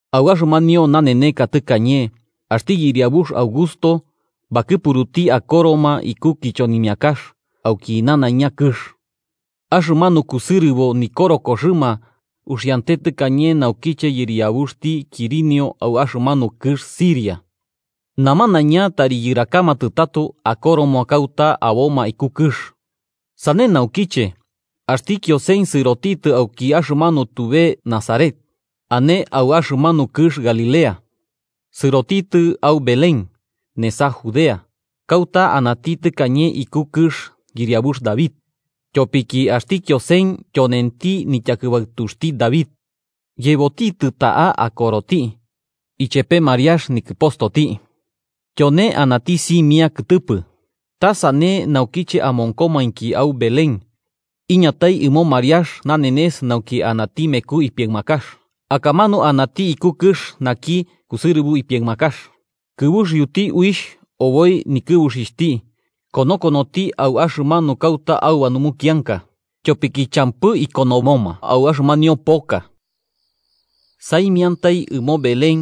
Au axɨmanio naneneka tɨkañe, axti yɨriabux Augusto bakɨpuruti akoroma iku kichonimiakax auki nanaiña kɨx. Axɨmanu kusɨrɨbo nikorokoxɨma uxiante tɨkañe naukiche yɨriabuxti Quirinio au axɨmanu kɨx Siria. Namanaiña tari yɨrakamatɨ tato akoroma kauta aboma iku kɨx. Sane naukiche, axti Kiosen sɨrotitɨ auki axɨmanu tube Nazaret, ane au axɨmanu kɨx Galilea, sɨrotitɨ au Belén, nesa Judea, kauta anati tɨkañe iku kɨx yɨriabux David, tyopiki axti Kiosen tyonenti nityakɨbaɨtuxti David. Yebotitɨ ta'a akoroti, ichepe Mariax, nikɨpostoti, tyone anati simia kɨtɨpɨ. Ta sane naukiche amonkomainki au Belén, iñatai ɨmo Mariax nanenes nauki anati meku ipiaɨmakax. Akamanu anati iku kɨx naki kusɨrɨbo ipiaɨmakax, kɨbuxiuti uixh oboi nikɨbuxixhti konokonoti au axɨmanu kauta auba numukianka, tyopiki champɨ konomoma au axɨmanio poka. Saimiantai ɨmo Belén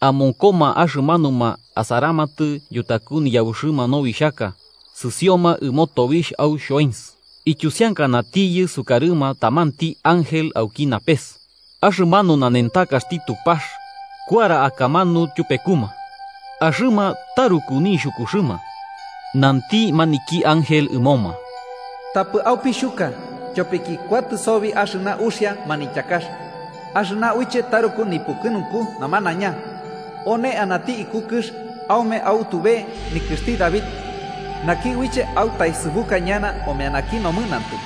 amonkoma axɨmanuma asaramatɨ yutaku niyabuxɨma nobixhaka sɨsioma ɨmo tobixh au xhoens. Ityusiankanatiyɨ sukarɨma tamanti ángel auki napes, axɨmanu nanentakaxti Tupax kuara akamanu tyupekuma. Axɨma taruku nixhukuxɨma. Nanti maniki ángel ɨmoma: “Tapɨ aupixhuka, tyopiki kuatɨ sobi axɨna uxia manityakax, axɨna uiche taruku nipukɨnunku namanaiña: One anati iku kɨx aume au tube nikɨxti David naki uiche autaesɨbuka ñana omeanaki nomɨnantɨ,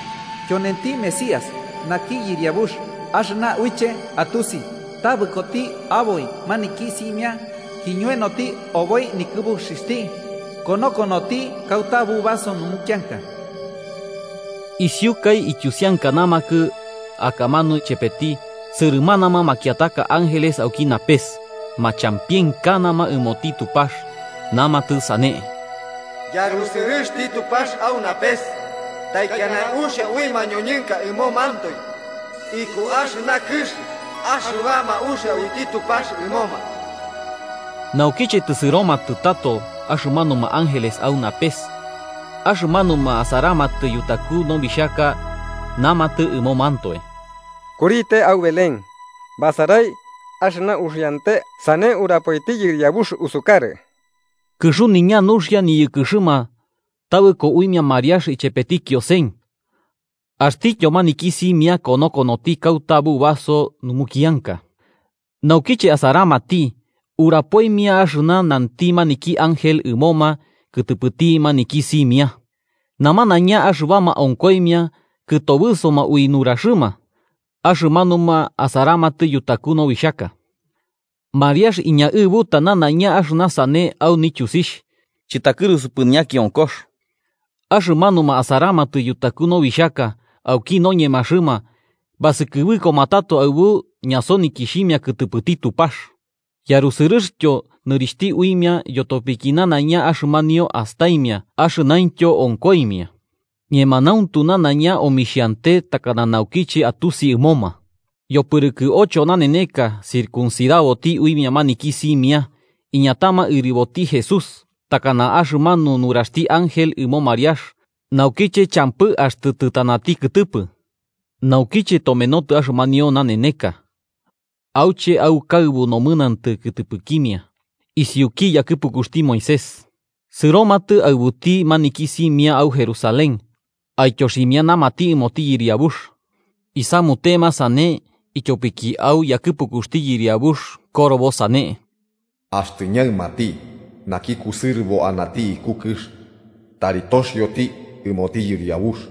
tyonenti Mesías, naki Yɨriabux. Axɨna uiche atusi, tabɨkoti aboi maniki simia kiñoenoti oboi nikɨbuxixhti konokonoti kauta bubaso numukianka.” Isiukai ityusiankanamakɨ, akamanu chepeti, sɨrɨmanama makiataka ángeles auki napes, machampienkanama ɨmoti Tupax namatɨ sane: “¡Yarusɨrɨxti Tupax au napes! ¡Taikiana uxia ui mañoñɨnka ɨmomantoe iku axɨna kɨx axɨbama uxia uiti Tupax ɨmoma!” Naukiche tɨsɨromatɨ tato axɨmanuma ángeles au napes, axɨmanuma asaramatɨ yutaku nobixhaka namatɨ ɨmomantoe: –Kurite, au Belén, basarai axɨna uxiante sane urapoiti Yɨriabux usukarɨ. Kɨxuniña nuxia niyɨkɨxɨma tabɨko uimia Mariax ichepeti Kiosen, axtityo maniki simia konokonoti kauta bubaso numukianka. Naukiche asaramati, urapoimia axɨna nanti maniki ángel ɨmoma kɨtɨpɨti maniki simia, namanaiña axɨbama onkoimia kɨtobɨsoma ui nuraxɨma axɨmanuma asaramatɨ yutaku nobixhaka. Mariax iñaɨbuta nanaiña axɨna sane au nityusixh, chɨtakɨrusupɨ ñakionkox. Axɨmanuma asaramatɨ yutaku nobixhaka, auki noñemaxɨma, basɨkɨbɨkoma tato aɨbu ñasonikixhimia kɨtɨpɨti Tupax yarusɨrɨxtyo nɨrixhti uimia yotopiki nanaiña axɨmanio astaimia axɨnaintyo onkoimia, ñemanauntu nanaiña omixhante takana naukiche atusi ɨmoma. Yopɨrɨkɨ ocho naneneka circuncidaboti uimia maniki simia, iñatama ɨriboti Jesús, takana axɨmanu nuraxti ángel ɨmo Mariax naukiche champɨ axtɨ tɨtanati kɨtɨpɨ. Naukiche tomenotɨ axɨmanio naneneka auche aukaɨbu nomɨnantɨ kɨtɨpɨkimia isiuki yakɨpukuxti Moisés, sɨromatɨ aɨbuti maniki simia au Jerusalén aityoximianamati ɨmoti Yɨriabux. Isamutema sane ityopiki au yakɨpukuxti Yɨriabux korobo sane: “Axtɨ ñaɨmati naki kusɨrɨbo anati iku kɨx tari toxioti ɨmoti Yɨriabux.”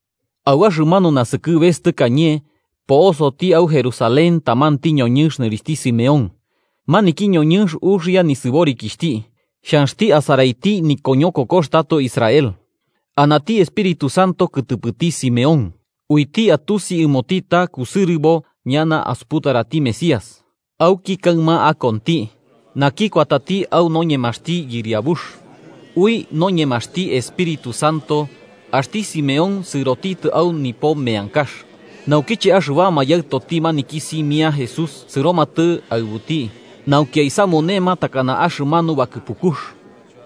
Au axɨmanu nasɨkɨbes tɨkañe po'osoti au Jerusalén tamanti ñoñɨnx nɨrixhti Simeón. Maniki ñoñɨnx uxia nisɨborikixhti, xhanxti asaraiti nikoñokokox tato Israel. Anati Espíritu Santo kɨtɨpɨti Simeón, uiti atusi ɨmoti ta kusɨrɨbo ñana asuputarati Mesías auki kaɨma akonti, naki kuatati au noñemaxti Yɨriabux. Ui noñemaxti Espíritu Santo, axti Simeón sɨrotitɨ au nipo meankax. Naukiche axɨbama yaɨtoti maniki simia Jesús sɨromatɨ aɨbuti, nauki aisamunema takana axɨmanu bakɨpukux,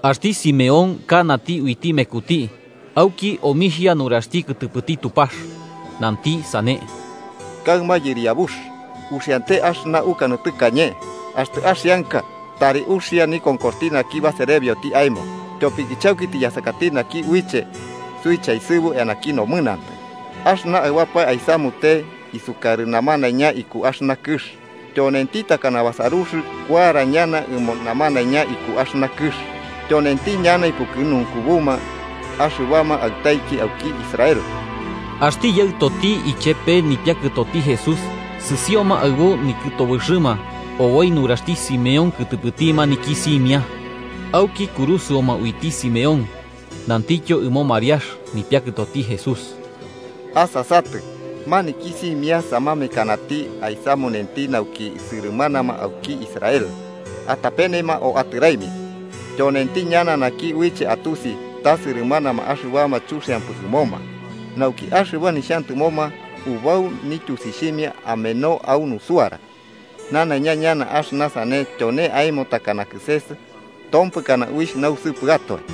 axti Simeón kanati uiti mekuti auki omixhia nuraxti kɨtɨpɨti Tupax, nanti sane: “Kaɨma, Yɨriabux, uxiante axɨna ukanɨ tɨkañe: Axtɨ axianka tari uxia nikonkoxti naki baserebioti aemo. Tyopiki chauki tiyasakati naki uiche suichaesɨbu eanaki nomɨnantɨ axɨna aɨbapae aisamute isukarɨ namanaiña iku axɨna kɨx, Tyonenti takana basarux kuara ñana ɨmo namanaiña iku axɨna kɨx tyonenti ñana ipukɨnunkubuma axɨbama aɨtaiki auki Israel.” Axti yaɨtoti ichepe nipiakɨtoti Jesús sɨsioma aɨbu nikɨtobɨxɨma oboi nuraxti Simeón kɨtɨpɨti maniki simia. Auki kurusɨoma uiti Simeón, nantityo ɨmo Mariax, nipiakɨtoti Jesús: –Asasatɨ, maniki simia samamekanati aisamunenti nauki sɨrɨmanama auki Israel atapenema o atɨraimia. Tyonenti ñana naki uiche atusi ta sɨrɨmanama axɨbama chuxiampɨ ɨmoma, nauki axɨba nixhantɨmoma ubau nityusixhimia ameno au nusuara. Nanaiña ñana axɨna sane tyone aemo takana kɨses tompɨkana uixh nausɨpɨatoe.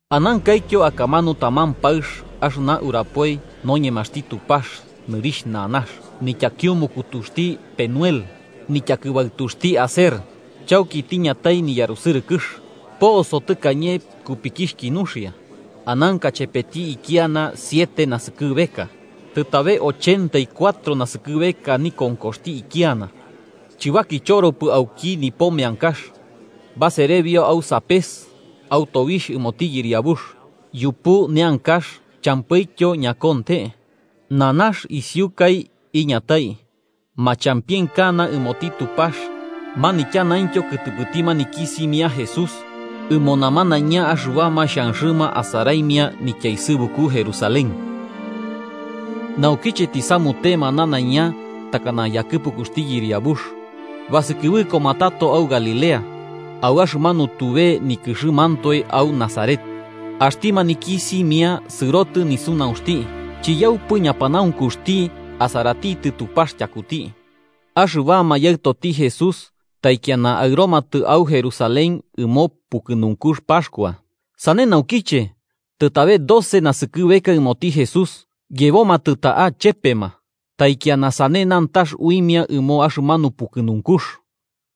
Anankaityo akamanu taman paɨx axɨna urapoi noñemaxti Tupax nɨrixh Nanax, nityakiumukutuxti Penuel, nityakɨbaɨtuxti Aser. Chauki tiñatai niyarusɨrɨkɨx. Poso tɨkañe kupikixhki nuxia, ananka chepeti ikiana siete naskɨbeka. Tɨtabe ochenta y cuatro naskɨbeka nikonkoxti ikiana. Chɨbakichoropɨ auki nipo meankax, baserebio au sapes au tobixh ɨmoti Yɨriabux, yupu neankax champɨityo ñakonte. Nanax isiukai iñatai, machampienkana ɨmoti Tupax manityanaintyo kɨtɨpɨti maniki simia Jesús ɨmo namanaiña axɨbama xhanxɨma asaraimia nityaesɨbuku Jerusalén. Naukiche tisamutema nanaiña takana yakɨpukuxti Yɨriabux, basɨkɨbɨkoma tato au Galilea, au axɨmanu tube nikɨxɨmantoe au Nazaret. Axti maniki simia sɨrotɨ nisunaunxti, chiyaupɨ ñapanaunkuxti asaratitɨ Tupax tyakuti. Axɨbama yaɨtoti Jesús taikiana aɨromatɨ au Jerusalén ɨmo pukɨnunkux Paxkua. Sane naukiche, tɨtabe doce naskɨbeka ɨmoti Jesús, yebomatɨ ta'a chepema, taikiana sane nantax uimia ɨmo axɨmanu pukɨnunkux.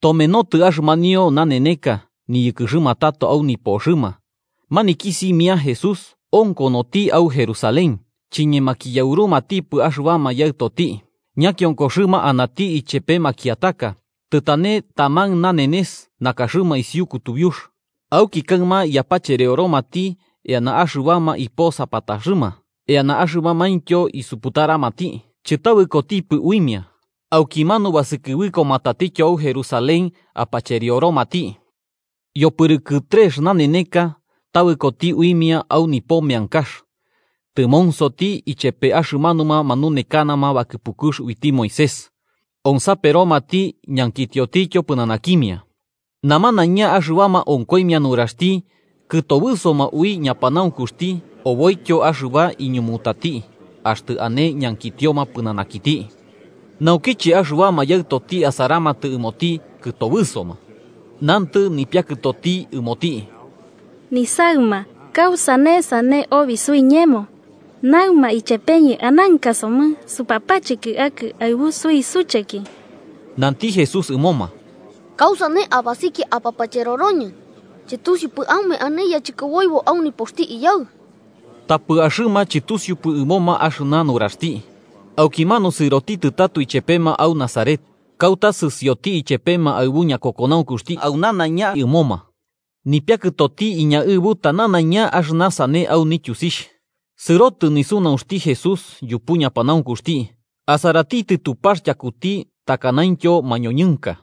Tomenotɨ axɨmanio naneneka, niyɨkɨxɨma tato au nipoxɨma, maniki simia Jesús onkonoti au Jerusalén, chiñemakiyaurumatipɨ axɨbama yaɨtoti. Ñakionkoxɨma anati ichepe makiataka, tɨtane taman nanenes nakaxɨma isiu kutubiux. Auki kaɨma yapacherioromati eana axɨbama iposapataxɨma eana axɨbamaintyo isuputaramati, chɨtabɨkotipɨ uimia. Aukimanu basɨkɨbɨkoma tatityo au Jerusalén apacherioromati. Yopɨrɨkɨ trex naneneka tabɨkoti uimia au nipo meankax, tɨmonsoti ichepe axɨmanuma manunekanama bakɨpukux uiti Moisés, onsaperomati ñankitiotityo pɨnanakimia. Namanaiña axɨbama onkoimia nuraxti kɨtobɨsoma ui ñapanaunkuxti oboityo axɨba iñumutati axtɨ ane ñankitioma pɨnanakiti. Naukiche axɨbama yaɨtoti asaramatɨ ɨmoti, kɨtobɨsoma. Nantɨ nipiakɨtoti ɨmoti: –Nisaɨma, ¿kausane sane obi suiñemo? Naɨma ichepeñɨ ananka somɨ supapacheki akɨ aɨbu suisucheki. Nanti Jesús ɨmoma: –¿Kausane abasikia apapacheroroñɨ? ¿Chɨtusiupɨ aume ane yachɨkoboibo au nipoxti Iyaɨ? Tapɨ axɨma chɨtusiupɨ ɨmoma axɨna nuraxti. Aukimanu sɨrotɨ tato ichepema au Nazaret, kauta sɨsioti ichepema aɨbu ñakokonaunkuxti au nanaiña ɨmoma. Nipiakɨtoti iñaɨbuta nanaiña axɨna sane au nityusixh. Sɨrotɨ nisunaunxti Jesús yupu ñapanaunkuxti, asaratitɨ Tupax tyakuti takanaintyo mañoñɨnka.